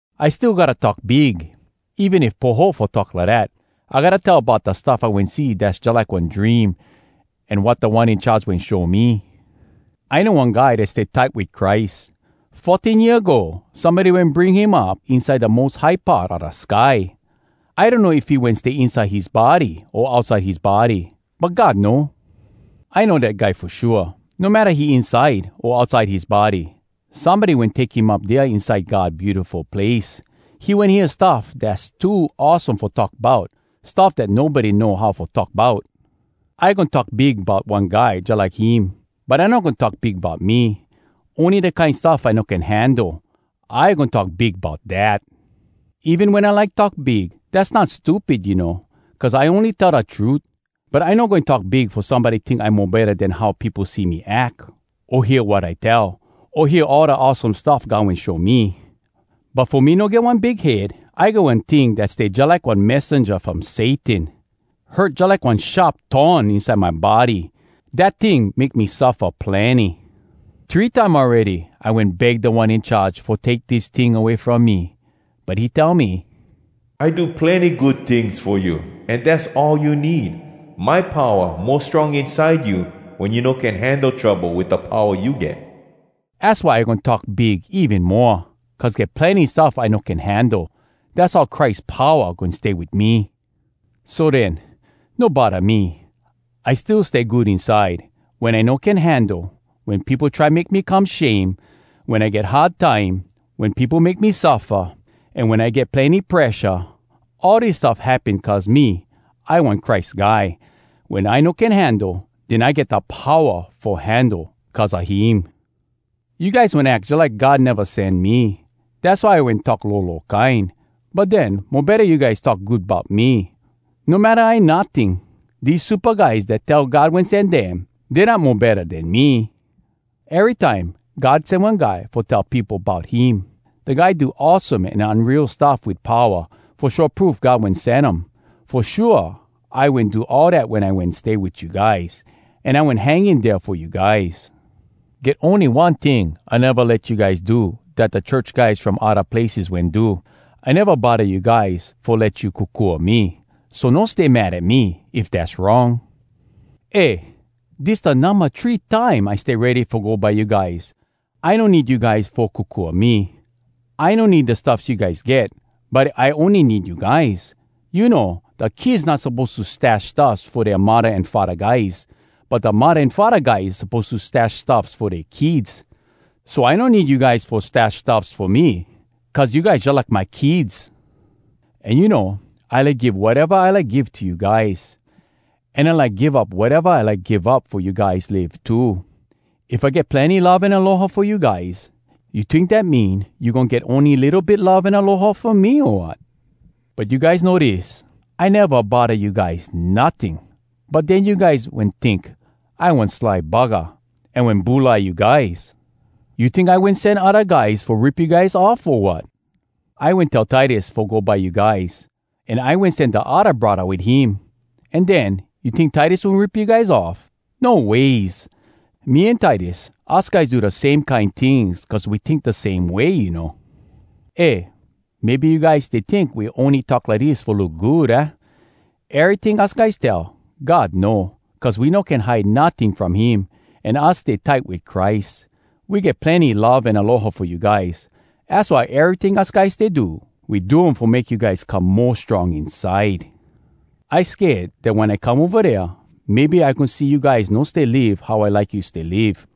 I still gotta talk big, even if poho fo talk lidat. I gotta tell bout da stuff I wen see dass jalike one dream, an wat Da One In Charge wen show me. I know one guy dat stay tight wit Christ. Fourteen year ago somebody wen bring him up inside da mos high part a da sky. I donno if he wen stay inside his body o outside his body, but God know. I know dat guy fo shua, no matta he inside o outside his body, somebody wen take him up dea inside God Beautiful Place. He wen hear stuff dass too awesome fo talk bout, stuff dat nobody know how fo talk bout. I goin talk big bout one guy jalike him, but I no goin talk big bout me. Ony da kine stuff I no can handle, I goin talk big bout dat. Even wen I like talk big, dass not stupid, you know, cuz I ony tell da trut. But I no goin talk big fo somebody tink I mo betta den how peopo see me ack, o hear wat I tell, o hear all da awesome stuff God wen show me. But fo me no get one big head, I get one ting dat stay jalike one messenja from Satan. Hurt jalike one sharp thorn inside my body. Dat ting make me suffa plenny. Three time awready I wen beg Da One In Charge fo take dis ting away from me. But he tell me, “I do plenny good tings fo you, an dass all you need. My powa mo strong inside you wen you no can handle trouble wit da powa you get.” Az why I goin talk big even moa, cuz get plenny stuff I no can handle. Dass how Christ powa goin stay wit me. So den, no bodda me. I still stay good inside, wen I no can handle, wen peopo try make me come shame, wen I get hard time, wen peopo make me suffa, an wen I get plenny presha. All dis stuff happen cuz me, I one Christ Guy. Wen I no can handle, den I get da powa fo handle cuz a him! You guys wen ack jalike God neva sen me. Dass why I wen talk lolo kine. But den, mo betta you guys talk good bout me. No matta I notting, dese supa guys dat tell God wen sen dem, dey not mo betta den me. Erytime God sen one guy fo tell peopo bout him, da guy do awesome an unreal stuff wit powa fo show proof God wen sen um. Fo shua, I wen do all dat wen I wen stay wit you guys, an I wen hang in dea fo you guys. Get ony one ting I neva let you guys do dat da church guys from odda places wen do: I neva bodda you guys fo let you kokua me. So no stay mad at me if dass wrong. Eh, dis da numba three time I stay ready fo go by you guys. I no need you guys fo kokua me. I no need da stuffs you guys get, but I ony need you guys. You know, da kids not suppose to stash stuffs fo dea muddah an faddah guys, but da muddah an faddah guys suppose to stash stuffs fo dea kids. So I no need you guys fo stash stuffs fo me cuz you guys jalike my kids! An you know, I like give wateva I like give to you guys, an I like give up wateva I like give up fo you guys live too. If I get plenny love an aloha fo you guys, you tink dat mean you goin get ony litto bit love an aloha fo me, o wat? But you guys know dis: I neva bodda you guys notting. But den you guys wen tink, I one sly buggah, an wen bulai you guys! You tink I wen sen odda guys fo rip you guys off, o wat? I wen tell Titus fo go by you guys, an I wen sen da odda braddah wit him. An den, you tink Titus wen rip you guys off? No ways! Me an Titus, us guys do da same kine tings cuz we tink da same way, you know. Eh, maybe you guys stay tink we ony talk lidis fo look good, aah? Eryting us guys tell, God know, cuz we no can hide notting from him, an us stay tight wit Christ. We get plenny love an aloha fo you guys. Az why eryting us guys stay do, we do um fo make you guys come mo strong inside. I sked dat wen I come ova dea, maybe I goin see you guys no stay live how I like you stay live.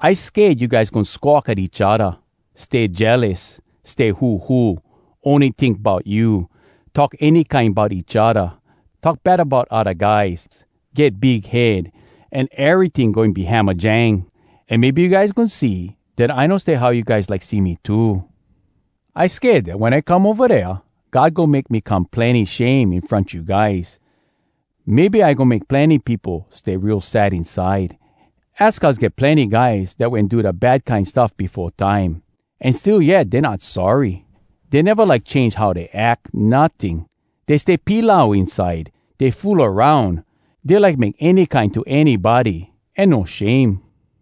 I sked you guys goin squawk at each odda, stay jealous, stay huhu, ony tink bout you, talk any kine bout each odda, talk bad bout odda guys, get big head, an eryting goin be hamajang. An maybe you guys goin see dat I no stay how you guys like see me too. I sked dat wen I come ova dea, God goin make me come plenny shame in front you guys. Maybe I goin make plenny peopo stay real sad inside. Az cuz get plenny guys dat wen do da bad kine stuff befo time, an still yet dey not sorry. Dey neva like change how dey ack notting. Dey stay pilau inside. Dey fool aroun. Dey like make any kine to anybody an no shame.